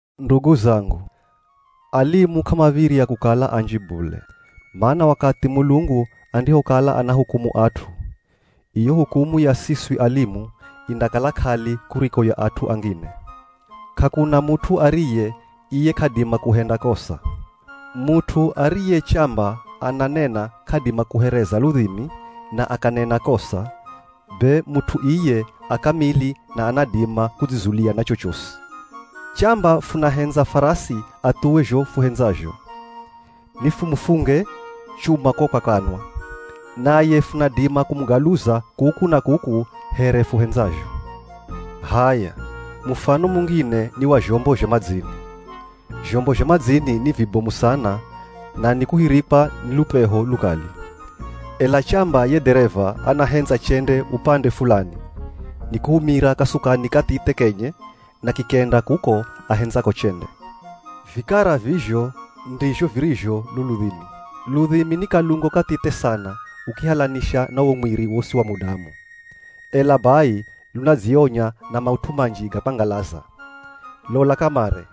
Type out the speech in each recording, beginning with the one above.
Ndugu zangu, alimu k'amav̱irya kukala anji bule, mana wakathi Mulungu andihokala anahukumu at'u, iyo hukumu ya siswi alimu indakala k'ali kuriko ya at'u angine. K'akuna mut'u ariye iye k'adima kuhenda kosa. Mut'u ariye chamba ananena k'adima kuhereza ludhimi na akanena kosa, be mut'u iye a kamili na anadima kudzizulia na chochosi. Chamba funahendza farasi athuwe zho fuhendzazho, nifumufunge chuma ko kwa kanwa, naye funadima kumugaluza kuku na kuku here fuhendzazho. H'aya, mufano mungine ni wa zhombo zha madzini. Zhombo zha madzini ni vibomu sana na nikuhirikwa ni lupeho lukali. Ela chamba ye dhereva anahendza chende upande fulani, nikuhumira kasukani kathithe kenye na kikenda kuko ahendzako chende. Vikara vizho ndizho virizho lo ludhimi. Ludhimi ni kalungo kathithe sana ukihalanisha na wo mwiri wosi wa mudamu, ela bai lunadzionya na maut'u manji ga kwangalaza. Lola kamare,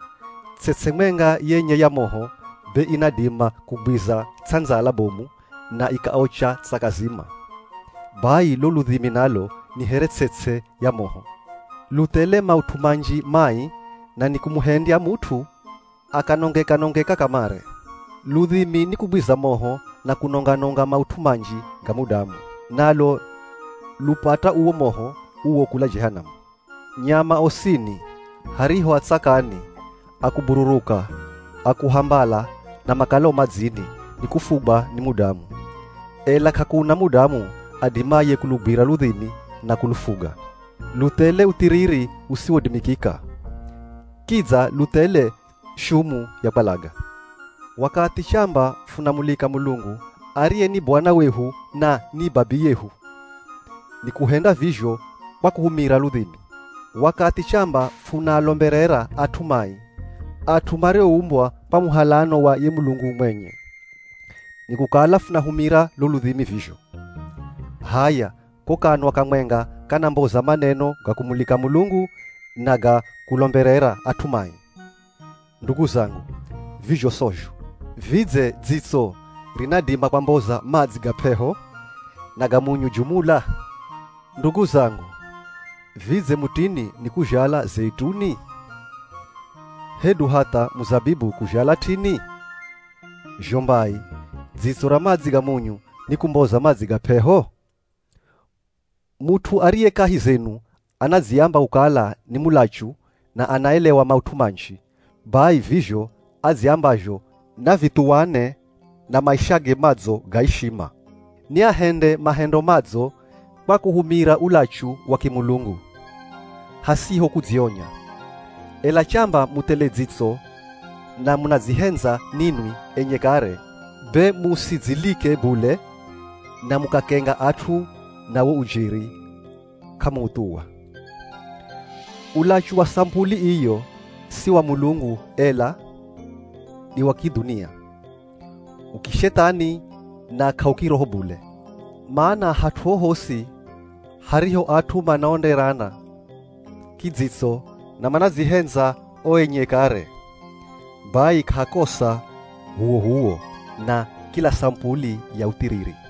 ts'ets'e mwenga yenye ya moho be inadima kugwiza ts'andzala bomu na ikaocha tsaka zima. Bai lo ludhimi nalo ni here ts'ets'e ya moho, lu thele maut'u manji mai na nikumuhendya mut'u akanongeka-nongeka kamare. Ludhimi nikugwiza moho na kunonga-nonga maut'u manji ga mudamu. Nalo lupata uwo moho uwo kula Jehanamu. Nyama osini, hariho a tsakani, a kubururuka, a kuhambala na makalao madzini, nikufugwa ni mudamu. Ela k'akuna mudamu adimaye kulugwira ludhimi na kulufuga. Lu thele uthiriri usiwodimikika. Kidza lu thele shumu ya kwalaga. Wakathi chamba funamulika Mulungu, ariye ni Bwana wehu na ni Babiyehu, nikuhenda vizho kwa kuhumira ludhimi. Wakathi chamba funaalomberera at'u mai, at'u marioumbwa kwa muhalano wa ye Mulungu mwenye, nikukala funahumira lo ludhimi vizho. H'aya, ko kanwa kamwenga kanamboza maneno ga kumulika Mulungu na ga kulomberera at'u mai. Ndugu zangu, vizho sozho. Vidze dzitso rinadima kwamboza madzi ga p'eho na ga munyu jumula? Ndugu zangu, vidze mutini nikuzhala zeituni? Hedu hatha muzabibu kuzhala t'ini? Zho mbai, dzitso ra madzi ga munyu nikumboza madzi ga p'eho? Mut'u ariye kahi zenu anadziamba kukala ni mulachu na anaelewa maut'u manji, bai vizho adziambazho na vithuwane na maishage madzo ga ishima. Ni ahende mahendo madzo kwa kuhumira ulachu wa kimulungu, hasiho kudzionya. Ela chamba mu thele dzitso na munadzihendza ninwi enye kare, be musidzilike bule na mukakenga at'u na wo ujeri k'amuuthuwa. Ulachu wa samupuli iyo, si wa Mulungu, ela ni wa kidhunia. U kishethani na k'aukiroho bule. Mana hat'u hohosi hariho at'u manaonerana kidzitso na manadzihendza o enye kare, bai k'ahakosa h'uwoh'uwo na kila samupuli ya uthiriri.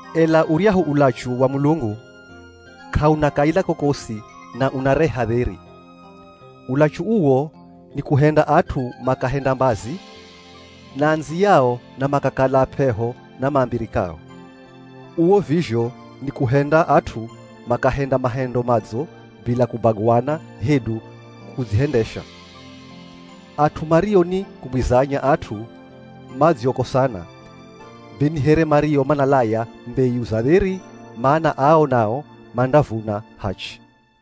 Ela uryahu ulachu wa Mulungu, k'auna kaila kokosi na unareha dheri. Ulachu uwo nikuhenda at'u makahenda mbazi na andziyao na makakala ap'eho na mambirikao. Uwo vizho ni kuhenda at'u makahenda mahendo madzo bila kubaguana hedu kudzihendesha. At'u mario ni kugwizanya at'u madziokosana, be ni here mario manalaya mbeyu za dheri, mana ao nao mandavuna hachi.